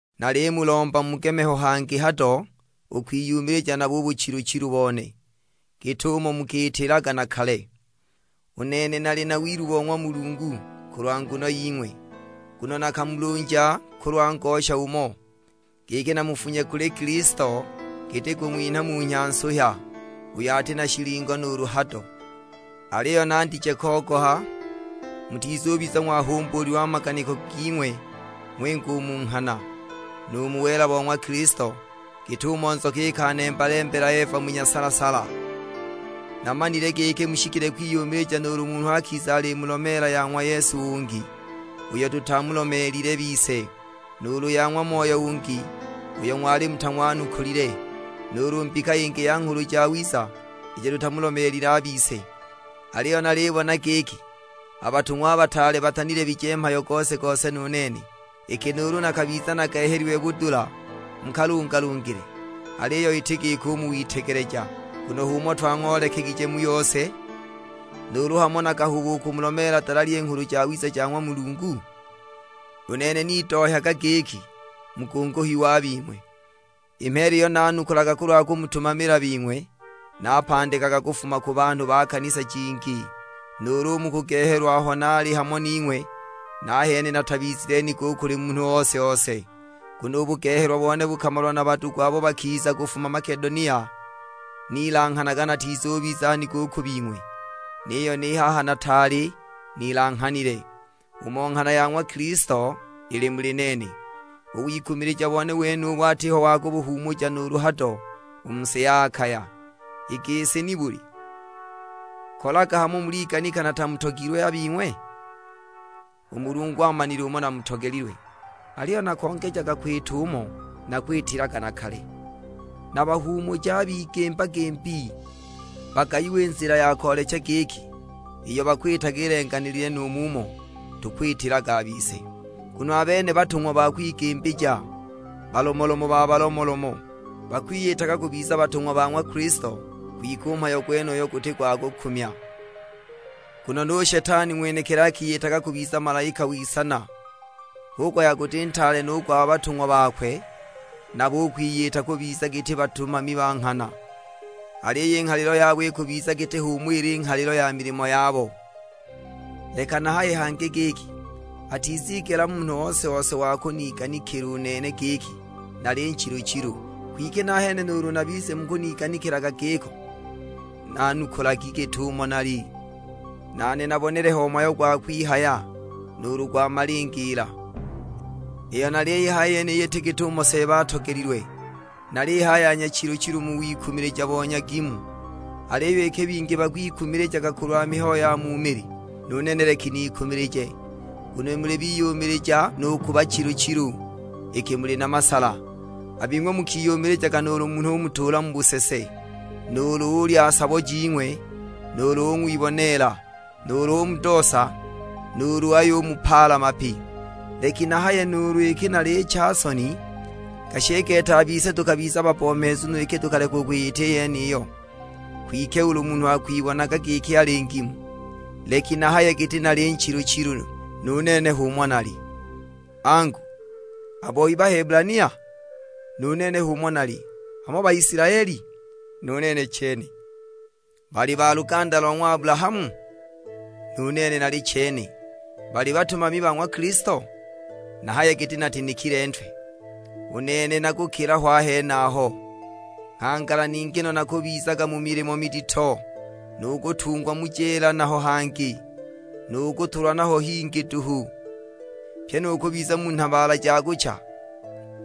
Nalimulomba mugeme ho hangi hado u kwiyumilija nabo u buchilu-chilu bone, git'umo mukiitilaga na kale! U nene nali na wilu bo ng'wa Mulungu kulwa nguno ying'we, nguno nakamulunja kulwa ngosha umo, giki namufunye kuli Kilisto giti kung'winha munhya nsuhya, uyo ati na shilingo nuulu hado. Aliyo nandije kogoha, mutizubiza ng'wahumbuulilwe a maganiko ging'we ng'winga u mu nghana, nu mu wela bo ng'wa Kilisto, git'umo nzoka ikanemba-lembela Eva mu nyasala-sala! Namanile giki mushikile kwiyumilija nuulu munhu akiza alimulomeela ya ng'wa Yesu ungi, uyo tutamulomeelile bise, nuulu ya ng'wa moyo ungi uyo ng'wali mutang'wanukulile, nuulu mbika yingi ya nghulu jawiza ijo tutamulomeelile a bise. Aliyo nalibona giki, a batung'wa a bataale batanilebije mhayo gose-gose nu nene. Iki nuulu nakabiza nagehelilwe budula mu kalungalungile, aliyo iti giko u mu witegeleja; nguno h'umo twang'oolekegije mu yose. Nuulu hamo nakahuba u kumulomeela dalali i Nghulu Jawiza ja ng'wa Mulungu? U nene nidohyaga giki mugunguhiwe a bing'we. I mheela iyo nanukulaga kulwa kumutumamila bing'we, napandikaga kufuma ku banhu ba kanisa jingi! Nuulu u mu kugehelwa aho naali hamo ning'we, nahene natabizile nigo kuli munhu ose-ose, nguno u bugehelwa bone bukamalwa na badugu abo bakiza kufuma Makedonia. Nilanghanaga natizubiza nigo u ku bing'we; niyo ni haha nataali nilanghanile. Umo nghana ya ng'wa Kilisto ili muli nene, u wikumilija bone wenubu atiho wa kubuhuumuja nuulu hado u mu si ya Akaya. I gisi nibuli? Kolaga hamo muliganika natamutogilwe a bing'we? U Mulungu amanile umo namutogelilwe. Aliyo nakongeja kwita umo nakwitilaga na kale, nabahuumuje a bigimba-gimbi; bagayiwe i nzila ya koolecha giki iyo bakwitaga ilenganilile nu mumo tukwitilaga a bise. Nguno a bene batung'wa ba kwigimbija, balomolomo ba balomolomo; bakwiyitaga kubiza batung'wa ba ng'wa Kilisto. Kwike u mhayo gwenuyu guti gwa kukumya, nguno nu Shetani ng'wenekili akiyitaga kubiza malaika w'isana! Hu kuhaya guti ntaale no u gwa batung'wa bakwe nabo u kwiyita kubiza giti batumami ba nghana; aliyo i nghalilo yabo ikubiza giti h'umo ili i nghalilo ya milimo yabo! Leki nahaye hangi giki, atizigela munhu ose-ose wa kuniganikila u nene giki nali nchilu-chilu; kwike nahene nuulu mubize mukuniganikilaga giko, nanukulagi git'umo nali, nane nabonele ho mhayo gwa kwihaya, nuulu gwa malingiila! Iyo naliyihaya yeniyi iti git'umo Seeba atogelilwe; nalihaya ya nyachilu-chilu mu wikumilija bo nyagimu. Aliyo iki bingi bakwikumilijaga kulwa mihayo ya mu mili, nu nene leki nikumilije, nguno muli biyumilija nu ku bachilu-chilu, iki muli na masala. A bing'we mukiyumilijaga nuulu munhu umutuula mu busese, nuulu ulya sabo jing'we; nuulu ung'wiboneela, nuulu umudoosa, nuulu ayumupaala mapi! Leki nahaye nuulu iki nalicha soni; gashi i gete a bise tukabiza babbomheezu no iki tukaleka u kwiyita i yeniyo! Kwike ulu munhu akwibonaga giki ali ngimu, leki nahaye giti nali nchilu-chilu; nu nene h'umo nali. Angu, a boi Bahebulania? Nu nene h'umo nali. Hamo Baisilaeli? Nu nene chene. Bali ba luganda lo ng'wa Abulahamu? Nu nene nali chene. Bali batumami ba ng'wa Kilisto? Nahaye giti natinikile ntwe: u nene na kukila ho a henaho! Nghangala ningi no nakubizaga mu milimo midito, nu kutungwa mu jeela naho hingi, nu kutulwa naho hingi duhu, pyi nu kubiza mu nhabaala ja kucha!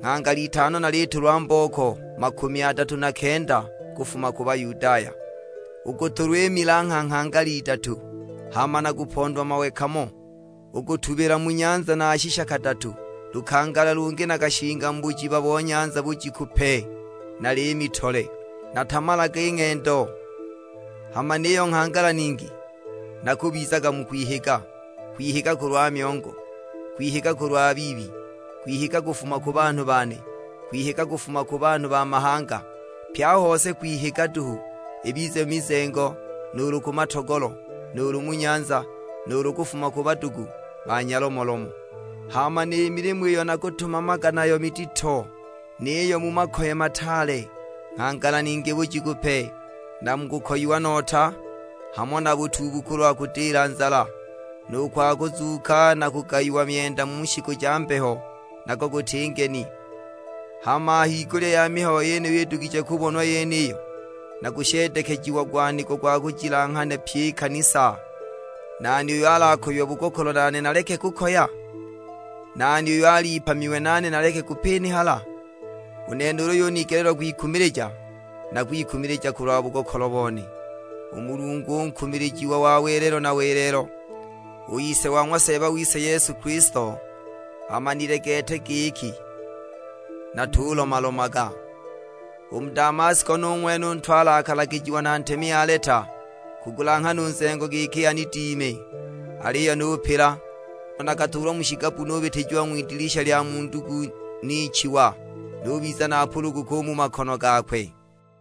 Nghangala itano nalitulwa mbooko makumi adatu na kenda kufuma ku Bayudaya. U kutulwa i milangha nghangala idatu, hama nakapondwa mawe kamo, u kutubila mu nyanza nashisha kadatu. Lukangala lungi nakashinga mu bujiba bo nyanza bujiku pe na liimi tole! Natamalaga i ng'endo, hama niyo nghangala ningi nakubizaga mu kwihiga: kwihiga kulwa myongo, kwihiga kulwa biibi, kwihiga kufuma ku banhu bane, kwihiga kufuma ku banhu ba mahanga. Pye a hose kwihiga duhu, ibize mu mizengo, nuulu ku matogolo, nuulu mu nyanza, nuulu kufuma ku badugu ba nyalomolomo! Hama ni milimo iyo nakutumamaga nayo midito, niyo mu makoye mataale. Nghangala ningi bujiku pe, na mu kukoyiwa nota, hamo na butuubu kulwa kudila nzala. Nu gwa kuzuuka na kugayiwa myenda mu shiku ja mbeho nago guti ngeni! Hama a higulya ya mihayo iyo idugije kubonwa yeniyo, nakusheedekejiagwa nigo gwa kujilanghana pyi i kanisa. Nani uyo alakoyiwe bugokolo nane naleke kukoya? Nani uyo alipamiwe nane naleke kupinihala? U nene ulu yunigeleelwa kwikumilija, nakwikumilija kulwa bugokolo bone. U Mulungu u Nkumilijiwa wa welelo na welelo, u Ise wa ng'wa Seeba wise Yesu Kilisto, amanile gete giki natulomalomaga. U mu Damasko nu ng'wene u ntwale akalagijiwa na ntemi Aleta kugulanghana u nzengo giki anidime. Aliyo nupila, nguno nakatuulwa mu shigabbu nubitijiwa ng'widilisha lya mu ndugu nichiwa, nubiza napuluguka u mu makono gakwe.